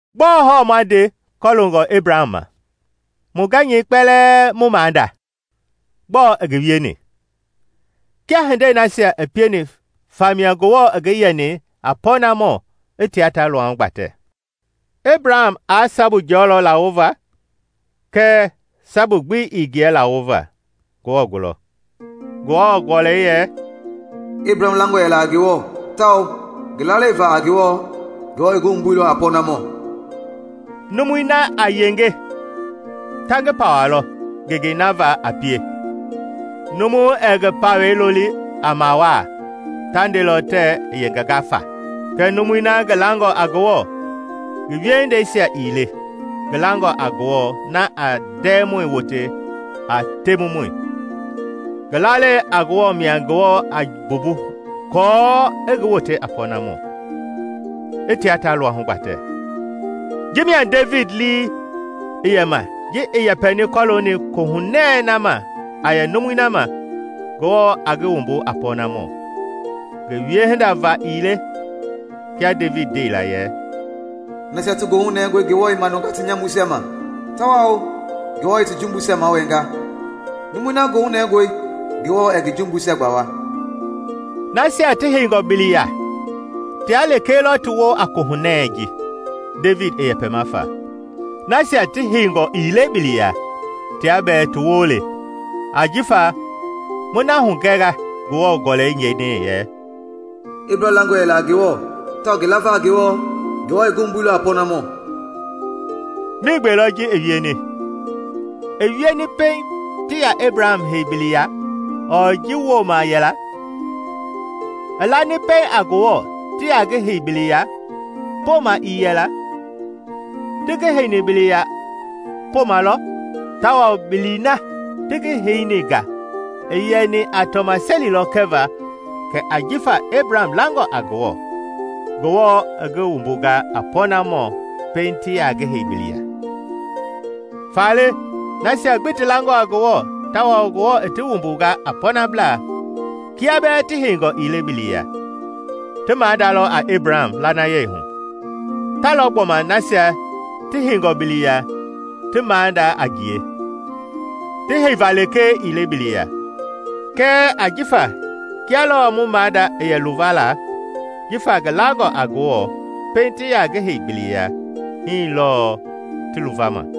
Gbɔɔ hɔɔ ma nde kɔloongɔ Ebraham ma, mu gɛnyɛi kpɛlɛɛ mu maada? Gbɔɔ i ngi wieni? Kiaa hindei nasia i pieni famia Ngewɔ i ngi yɛni a pɔɔnamɔ i tia ta luahu gbatɛ, Ebraham aa sabu jɔlɔ lawoova. Kɛɛ sabu gbi ii ngiɛ lawoova Ngewɔ gulɔ. Ngewɔ Gɔlɛi yɛ, “Ebraham langɔ yɛla a Ngewɔ, tawao ngi lalei va a Ngewɔ, Ngewɔ i ngi wumbuilɔ a pɔɔnamɔ.” Numui na a yenge ta ngi pawalɔ ngengei na va a pie; numu ɛɛ ngi pawɛi loli a mawaa, ta ndelɔ tɛɛ i yengenga faa. Kɛɛ numui na ngi langɔ a Ngewɔ, ngi wiehindeisia ii le, ngi langɔ a Ngewɔ na a ndɛɛmɔi wote a temumɔi, ngi lalei a Ngewɔ mia Ngewɔ a mbumbu aako i ngi wote a pɔnamɔ, i tia ta luahu gbatɛ. Ji mia Devidi lii i yɛ ma ji i yɛpɛni kɔlooni Kohunɛ na ma a yɛ numui na ma Ngewɔ a ngi wumbu a pɔnamɔ, ngi wiehinda va gbi ii le, Kia Devidi ndeila yɛ: “Nasia ti goohu nɛngɔe Ngewɔ i manunga ti nyamuisia ma, tawao Ngewɔ i ti jumbuisia mawɛɛnga! Numui na goohu nɛngɔe Ngewɔ ɛɛ ngi jumbuisia gbawa!” Nasia ti heingɔ bili ya tia lekee lɔ ti woo a Kohunɛ ji Devidi i yɛpɛma fa? Nasia ti heingɔ ii le bili ya tia bɛɛ ti woo le. Ajifa mu na hugɛnga Ngewɔ Gɔlɛi ndeni yɛ, “Ebraham langɔ yɛla a Ngewɔ tawao ngi lava a Ngewɔ, Ngewɔ i ngi wumbuilɔ a pɔɔnamɔ.” Miigbee lɔ ji i wieni? I wieni pɛiŋ ti yaa Ebraham hei biliya ɔɔ ji woma yɛla? I lani pɛiŋ a Ngewɔ ti yaa ngi hei bili ya, poma ii yɛla? Ti ngi heini bili ya poma lɔ, tawao bili na ti ngi heini nga i yɛni a tɔmaseli lɔ kɛva kɛ jifa Ebraham langɔ a Ngewɔ, Ngewɔ i ngi wumbunga a pɔɔnamɔ pɛiŋ ti yaa ngi hei biliya. Faale nasia gbi ti langɔ a Ngewɔ tawao Ngewɔ i ti wumbunga a pɔɔnablaa kia bɛɛ ti heingɔ ii le bili ya, ti maada lɔ a Ebraham lanayeihu. Ta lɔ gbɔma nasia ti heingɔ bili ya ti maada a ngie, ti heiva lekee ii le bili ya, kɛɛ ajifa kia lɔɔ mu maada i yɛ luva la jifa ngi langɔ a Ngewɔ pɛiŋ ti yaa ngi hei bili ya, hii lɔɔ ti luvama.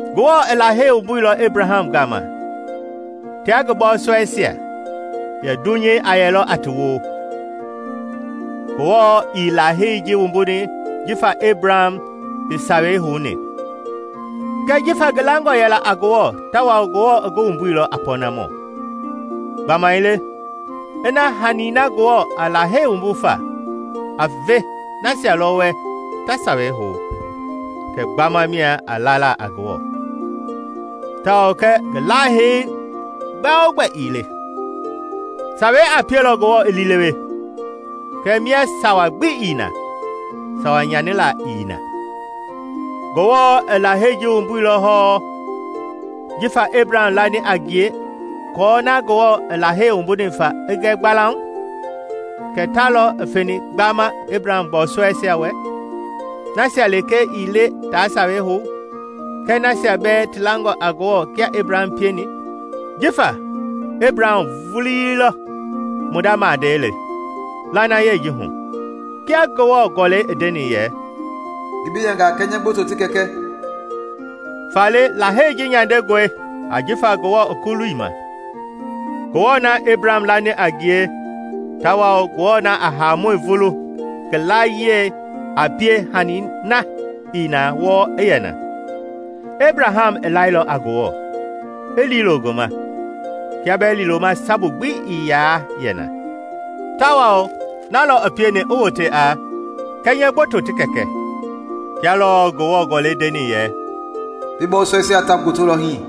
Ngewɔ i Lahei wumbuilɔ Ebraham gama tia ngi bɔɔsɔɛisia yɛ dunyei a yɛlɔ a ti woo. Ngewɔ ii Lahei ji wumbuni jifa Ebraham i Sawei houni, kɛɛ jifa ngi langɔ yɛla a Ngewɔ tawao Ngewɔ i ngi wumbuilɔ a pɔnamɔ. Gbamaile ina hani na Ngewɔ a Lahei wumbu fa a ve nasia lɔ wɛ ta Sawei hou kɛ gbama mia a lala a Ngewɔ, tao kɛ ngi Lahei gbɛogbɛ ii le. Sawei a pielɔ Ngewɔ i liilewe; kɛɛ mia Sawa gbi ii na, sawa nyanila ii na. Ngewɔ i Lahei ji wumbuilɔ hɔɔ jifa Ebraham lani a ngie aako na Ngewɔ i Lahei wumbuni fa i gɛ gbalauŋ kɛ ta lɔ i feni gbama Ebraham bɔɔsɔɛisia wɛ -- nasia lekee ii le ta Sawei hou, kɛɛ nasia bɛɛ ti langɔ a Ngewɔ kia Ebraham pieni. Jifa Ebraham vuilɔ mu maada le lanayei ji hu. Kia Ngewɔ Gɔlɛi i ndeni yɛ, “Ngi bi yɛnga a kɛnyɛ gboto ti kɛkɛ.” Faale Lahei ji nyandengɔe ajifa Ngewɔ i kuluilɔ ma, Ngewɔ na Ebraham lani a ngie tawao Ngewɔ na a haamɔi vulu ngi layie a pie hani na ii na wɔɔ i yɛ na. Ebraham i lailɔ a Ngewɔ i liilo ngi ma kia bɛɛ liiloma sabu gbi ii yaa yɛ na, tawao na lɔ i pieni i wote a “Kɛnyɛ gboto ti kɛkɛ.” Kia lɔɔ Ngewɔ Gɔlɛi ndeni yɛ, “Bi bɔɔsɔɛisia ta gbotolɔ hii.”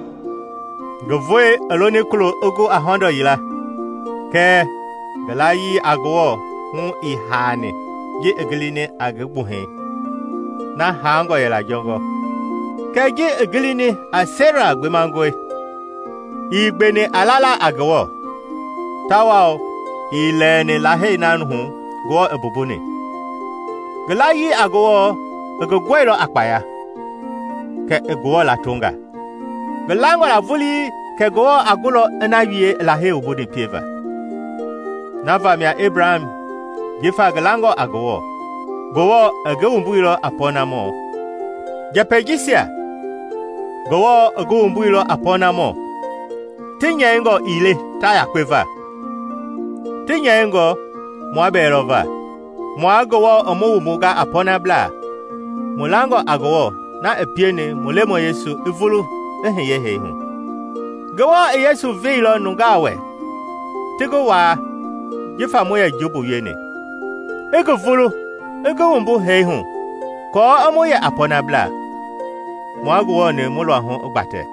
Ngi voi i loni kulo i gu a hɔndɔ yila; kɛɛ ngi layii a Ngewɔ hu ii haani ji i gilini a ngi gbuhɛi na haangɔ yɛla jɔngɔ, kɛɛ ji i gilini kɛ Sera gbemangɔe. Ii gbeni a lala a Ngewɔ tawao ii lɛɛni Lahei na hu Ngewɔ i mbumbuni; ngi layii a Ngewɔ i ngi gɔilɔ a kpaya, kɛ i Ngewɔ latonga. Ngi langɔ la vulii kɛ Ngewɔ a gulɔ i na wie i Lahei wumbuni pieva. Na vamia Ebraham, jifa ngi langɔ a Ngewɔ, Ngewɔ i ngi wumbuni a pɔɔnamɔ. Njɛpɛi jisia “Ngewɔ i ngi wumbuilɔ a pɔɔnamɔ” ti nyɛingɔ ii le ta yakpe va. Ti nyɛingɔ mua bɛɛ lɔ va, mua Ngewɔ i mu wumbunga a pɔɔnablaa, mu langɔ a Ngewɔ na i pieni mu Lemɔi Yesu i vulu i hiye hee hu. Ngewɔ i Yesu veilɔ nungaa wɛ ti ngi waa jifa mu yɛ jumbu wieni, i ngi vulu i ngi wumbu hee hu aako i mu yɛ a pɔɔnablaa, mua Ngewɔ-ni mu luahu i gbatɛ.